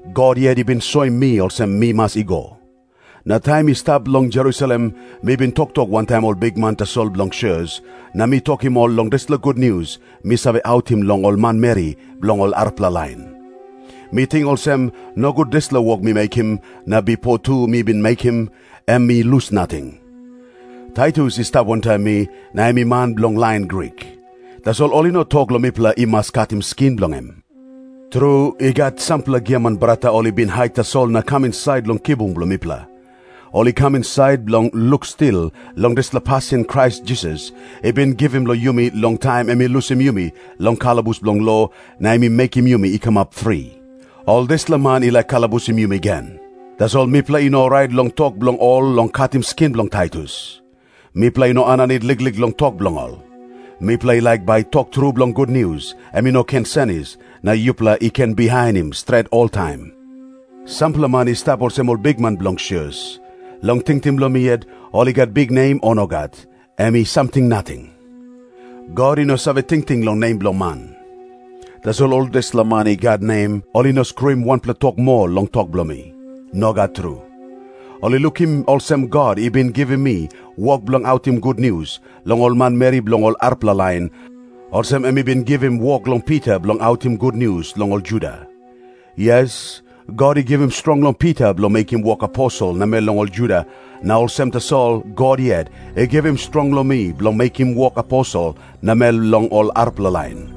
God yet i bin soim mi olsem mi mas i go. Na taim mi stap long Jerusalem, mi bin toktok wantaim ol bikman tasol bilong sios, na mi tokim ol long dispela gutnius mi save autim long ol manmeri bilong ol arapela lain. Mi ting olsem, nogut dispela wok mi mekim, na bipo tu mi bin mekim, em i lus nating. Taitus i stap wantaim mi, na em i man bilong lain Grik. Tasol ol i no tok long mipela i mas katim skin bilong em. Tru, i gat sampela giaman brata ol i bin hait tasol na kam insait long kibung bilong mipela. Ol i kam insait bilong luk stil long dispela pasin Krais Jisas i bin givim long yumi long taim em i lusim yumi long kalabus bilong lo, na em i mekim yumi i kamap fri. Ol dispela man i laik kalabusim yumi gen. Tasol mipela i no orait long tok bilong ol long katim skin bilong Taitus. Mipela i no aninit liklik long tok bilong ol. Mipela i laik bai tok tru bilong gutnius em i no ken senis, na yupela i ken bihainim stret oltaim. Sampela man i stap olsem ol bikman bilong sios. Long tingting bilong mi yet, ol i gat biknem o nogat, em i samting nating. God i no save tingting long nem bilong man. Tasol ol dispela man i gat nem, ol i no skruim wanpela tok moa long tok bilong mi. Nogat tru. Ol i lukim olsem God i bin givim mi wok bilong autim gutnius long ol manmeri bilong ol arapela lain, olsem em i bin givim wok long Pita bilong autim gutnius long ol Juda. Yes, God i givim strong long Pita bilong mekim wok aposel namel long ol Juda, na olsem tasol God yet i givim strong long mi bilong mekim wok aposel namel long ol arapela lain.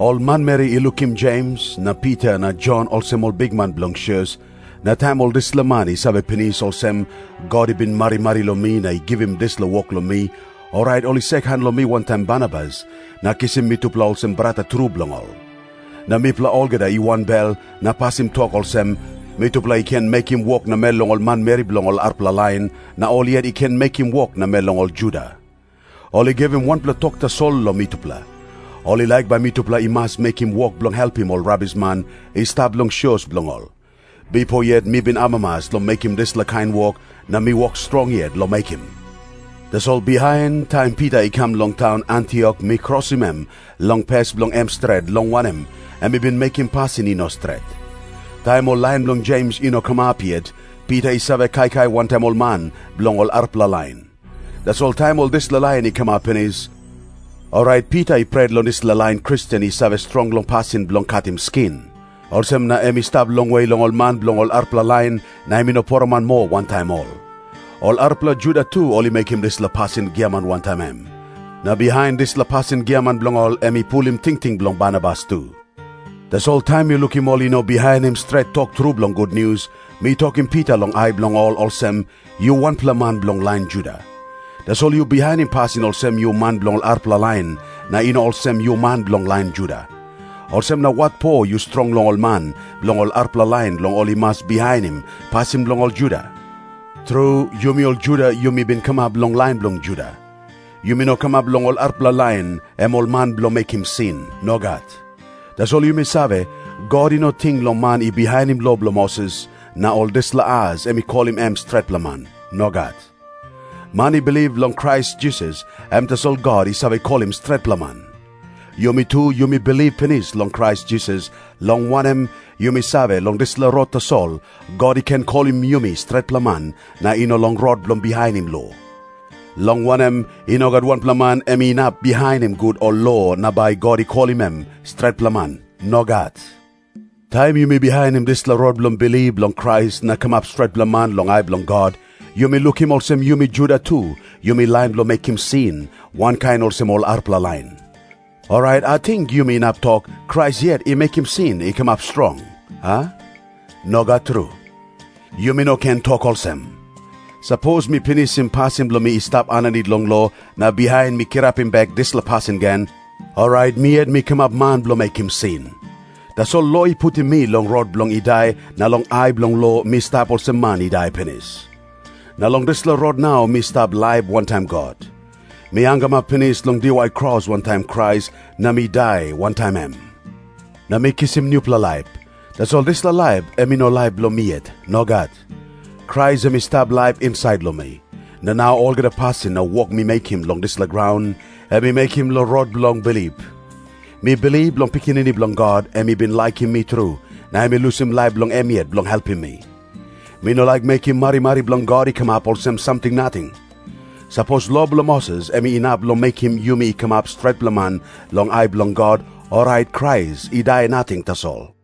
Ol manmeri i lukim Jems na Pita na Jon olsem ol bikman bilong sios, na taim ol dispela man i save pinis olsem, God i bin marimari long mi na i givim dispela wok long mi, orait ol i sekan long mi wantaim Barnabas, na kisim mitupela olsem brata tru bilong ol. Na mipela olgeta i wanbel na pasim tok olsem, mitupela i ken mekim wok namel long ol manmeri bilong ol arapela lain, na ol yet i ken mekim wok namel long ol Juda. Ol i givim wanpela tok tasol long mitupela. Ol i laik bai mitupela i mas mekim wok bilong helpim ol rabisman i stap long sios bilong ol. Bipo yet mi bin amamas long mekim dispela kain wok, na mi wok strong yet long mekim. Tasol bihain, taim Pita i kam long taun Antiok, mi krosim em long pes bilong em stret, long wanem, em i bin mekim pasin i no stret. Taim ol lain bilong Jems i no kamap yet, Pita i save kaikai wantaim ol man bilong ol arapela lain. Tasol taim ol dispela lain i kamap pinis, orait Pita i pret long dispela lain Kristen i save strong long pasin bilong katim skin. Olsem na em i stap longwe long ol man bilong ol arapela lain, na em i no poroman moa wantaim ol. Ol arapela Juda tu ol i mekim dispela pasin giaman wantaim em. Na bihain dispela pasin giaman bilong ol em i pulim tingting bilong Barnabas tu. Tasol taim mi lukim ol i no bihainim stret tok tru bilong gutnius, mi tokim Pita long ai bilong ol olsem, “Yu wanpela man bilong lain Juda. Tasol yu bihainim pasin olsem yu man bilong arapela lain, na i no olsem yu man bilong lain Juda. Olsem na watpo yu strong long ol man bilong ol arapela lain long ol i mas bihainim pasin bilong ol Juda?” Tru, yumi ol Juda yumi bin kamap long lain bilong Juda. Yumi no kamap long ol arapela lain, em ol man bilong mekim sin. Nogat. Tasol yumi save, God i no ting long man i bihainim lo bilong Moses, na long dispela as em i kolim em stretpela man. Nogat. Man i bilip long Krais Jisas, em tasol God i save kolim stretpela man. Yumi tu yumi bilip pinis long Krais Jisas, long wanem, yumi save, long dispela rot tasol God i ken kolim yumi stretpela man, na i no long rot bilong bihainim lo. Long wanem, i no gat wanpela man em inap bihainim gut ol lo na bai God i kolim em stretpela man. Nogat. Taim yumi bihainim dispela rot bilong bilip long Krais na kamap stretpela man long ai bilong God, yumi lukim olsem yumi Juda tu yumi lain bilong mekim sin wankain olsem ol arapela lain. Orait ating yumi inap tok, Krais yet em i laik mekim sin i kamap strong, a? Nogat tru. Yumi no ken tok olsem. Sapos mi pinisim pasin bilong i stap aninit long lo na bihain mi kirapim bek dispela pasin gen, orait mi yet mi kamap man bilong mekim sin. Tasol lo i putim mi long rot bilong i dai na long ai bilong lo mi stap olsem man i dai pinis. Na long dispela rot nau mi stap laip wantaim God. Mi hangamap pinis long diwai kros wantaim Krais na mi dai wantaim em na mi kisim nupela laip. Tasol dispela laip em i no laip bilong mi yet. Nogat. Krais em i stap laip insait long mi. Na nau olgeta pasin na wok mi mekim long dispela graun, em mi mekim long rot bilong bilip. Mi bilip long Pikinini Bilong God em i bin laikim mi tru na em i lusim laip bilong em yet bilong helpim mi. Mi no laik mekim marimari bilong God i kamap olsem samting nating. Sapos lo bilong Moses em inap long mekim yumi i kamap stretpela man long ai bilong God, orait Krais i dai nating tasol.